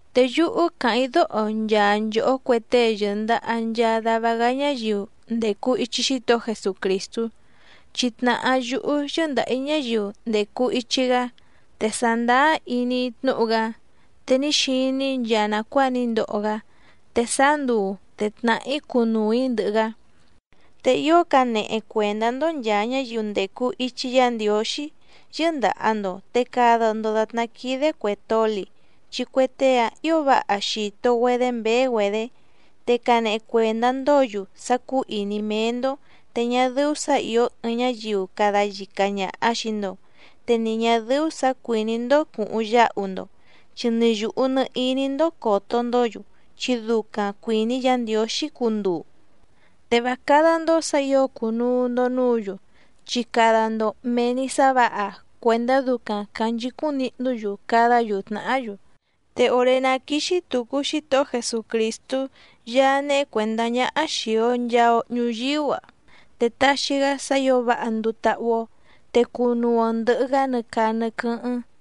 Te yúhú càháⁿ‑í dóho nchaa nchòhó cue tée yɨ̀ndaha nchaa dava‑gá ñáyiu ndècu ichi Xítohó Jesucrìstú, chi tnàhá yúhú yɨ́ndàha‑í ñáyiu ndècu ichi‑gá, te sàndáá iní‑í tnúhu‑gá, te ní xiní‑í nchaa nàcuáa ní ndoho‑gá, te sáá nduu te tnàhá‑í cunuu‑ǐ ndɨhɨ‑gá. Te ío canehe cuèndá‑ndó nchàa ñáyiu ndècu ichi Yá Ndiǒxí yɨ́ndàha‑ndo te cada‑ndo dàtná quídé cuè toli, chi cue tée‑áⁿ ǐo váha xìto‑güedé mběé‑güedě. Te canehe cuèndá‑ndǒ‑yu sá cúú ìní méé‑ndó te ñá dɨ́ú sǎ ìó ɨɨⁿ ñáyiu cada yica ñàha xii‑ndo, te ni ñà dɨ́ú sǎ cuìní‑ndó cùhuⁿ yáhu‑ndo, chi nɨ yùhu nɨ iní‑ndó còto‑ndó‑yu, chi ducaⁿ cuìní Yǎ Ndiǒxí cunduu. Te vá cádá‑ndó sǎ ǐo cùnuu‑ndo núǔ‑yu, chi cada‑ndo mèe‑ni sá vǎha cuèndá ducaⁿ cànchicúⁿ nihnú‑yu cadá‑yu tnàhá‑yu. Te òré ná quíxí tùcu Xítohó Jesucrìstú Yaá néhé cuèndá ñáhá xìi‑o nchaa‑o ñuyíú‑a, te taxi‑gá sá ǐo váha nduu táhú‑ó, te cunuu‑o ndɨ̀hɨ‑gá nɨ caa nɨ quɨ́hɨ́ⁿ.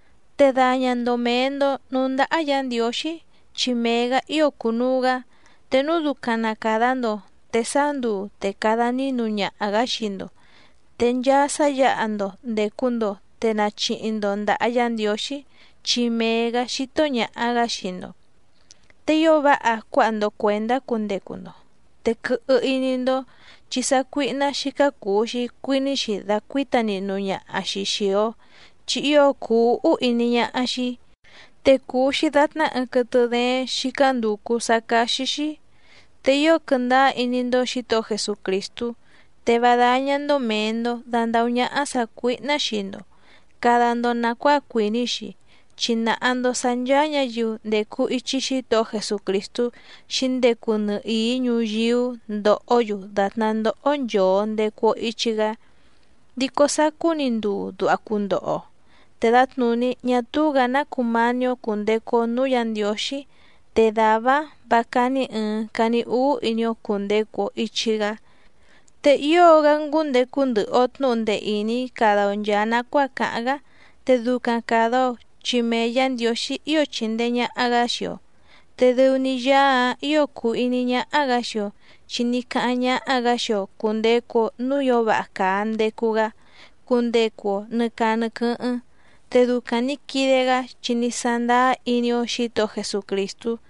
Te daña‑ndo mèe‑ndo núú ndáhá Yǎ Ndiǒxí, chi mee‑gǎ ío cùnuu‑gá. Te núu ducaⁿ na càda‑ndo, te sáá nduu te cada nínu ñaha‑gǎ xii‑ndo. Te nchaa sá yǎha‑ndo ndècu‑ndo te nachihi‑ndo ndàha Yá Ndiǒxí, chi mee‑gǎ xító ñàha‑gá xii‑ndo. Te ío váha cuáha‑ndo cuèndá cundecu‑ndo, te quɨhɨ iní‑ndó chi sácuíhná xícá cùu‑xi cuiní‑xi dacuǐta nihnu ñaha‑xi xìi‑o, chi ío cùu úhú iní ñáhá‑xí, te cùu‑xi datná ɨɨⁿ quɨtɨ dééⁿ xícá ndùcu sá cáxí‑xí. Te ío quɨndáá iní‑ndó Xǐtohó Jesucrìstú, te vá dáñá‑ndó mèe‑ndo dandahú ñáhá sàcuíhná xii‑ndo càda‑ndo nacuáa cuìní‑xi, chi nàha‑ndo sá ncháá ñǎyiu ndècu ichi Xítohó Jesucrìstú xǐndecu nɨhìí ñuyíú ndóhǒ‑yu dàtná ndóhó nchòo ndecu‑o ichi‑gá. Dico sacú‑ni nduu duha cundoho‑o te dǎtnùní ñá túú‑gǎ ná cumání‑ó cùndecu‑o núú Yǎ Ndiǒxí, te dàvá‑áⁿ vǎ cání ɨ̀ɨⁿ cani úú iní‑ó cùndecu‑o ichi‑gá. Te ío‑gá ngúndecu ndɨhɨ‑o tnǔhu ndee ìní cada‑o nchàa nacuáa càháⁿ‑gá, te ducaⁿ càda‑o chi mee Yǎ Ndiǒxí ío chindee ñàha‑gá xii‑o, te dɨu‑ni Yaá‑ǎⁿ ǐo cùu iní ñáhá‑gǎ xii‑o, chi ní cáháⁿ ñáhá‑gǎ xii‑o cùndecu‑o núú ǐo váha càa ndecu‑gá cundecu‑o nɨ̀ caa nɨ quɨ́hɨ́ⁿ, te ducaⁿ nǐ quide‑gá chi ní sándáá iní‑ó Xǐtohó Jesucrìstú.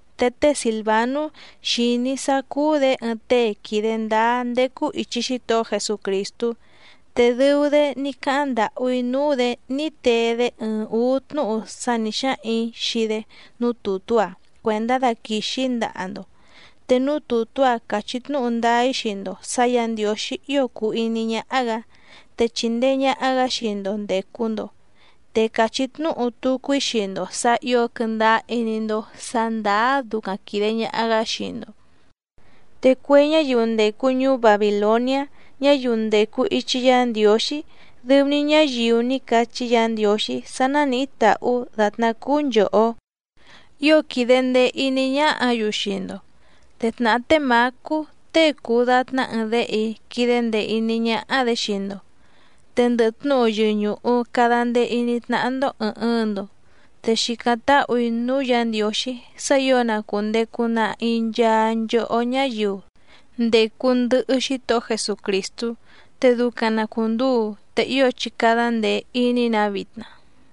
Te té Sìlvanú xìní‑í sá cúú‑dě ɨɨⁿ tée quìde ndáá ndécú ìchi Xítohó Jesucrìstú, te dɨu‑dé ní cáháⁿ ndàhú‑í núú‑dě ní tee‑dé ɨɨⁿ ǔú tnúhu sá nǐ xáhaⁿ‑ǐ xii‑dé núú tùtú‑a cuèndá daquìxi‑í ndaha‑ndo, te núú tùtú‑a càchí tnúhu ndáá‑í xii‑ndo sǎ Yǎ Ndiǒxí ío cùu iní ñáhá‑gǎ, te chìndee ñaha‑gá xii‑ndo ndècu‑ndo, te càchí tnúhu tucu‑í xii‑ndo sǎ ǐo quɨndáá iní‑ndó sǎ ndàá ducaⁿ quìde ñaha‑gá xii‑ndo. Te cue ñáyiu ndècu ñuú Babìloniá, ñáyiu ndècu ichi Yá Ndiǒxí, dɨu‑ni ñáyiu ní cachí Yǎ Ndiǒxí sá nánìhí tàhú dàtná cúú nchòhó, ío quìde ndee iní ñáhǎ‑yu xii‑ndo, te tnàhá té Mǎcú tée cùu datná ɨɨⁿ déhe‑í quídé ndèe iní ñáhá‑dě xii‑ndo. Te ndɨhɨ tnúhu yɨñùhu cada ndee iní tnáhá‑ndó ɨ̀ɨⁿ ɨɨⁿ‑ndo, te xìcáⁿ táhù‑í núú Yǎ Ndiǒxí sá ǐo na cùndecu nahi nchaa nchohó ñáyiu ndècu ndɨhɨ Xítohó Jesucrìstú. Te ducaⁿ na cùnduu. Te ío chí cádá ndèe iní‑nǎ vitna.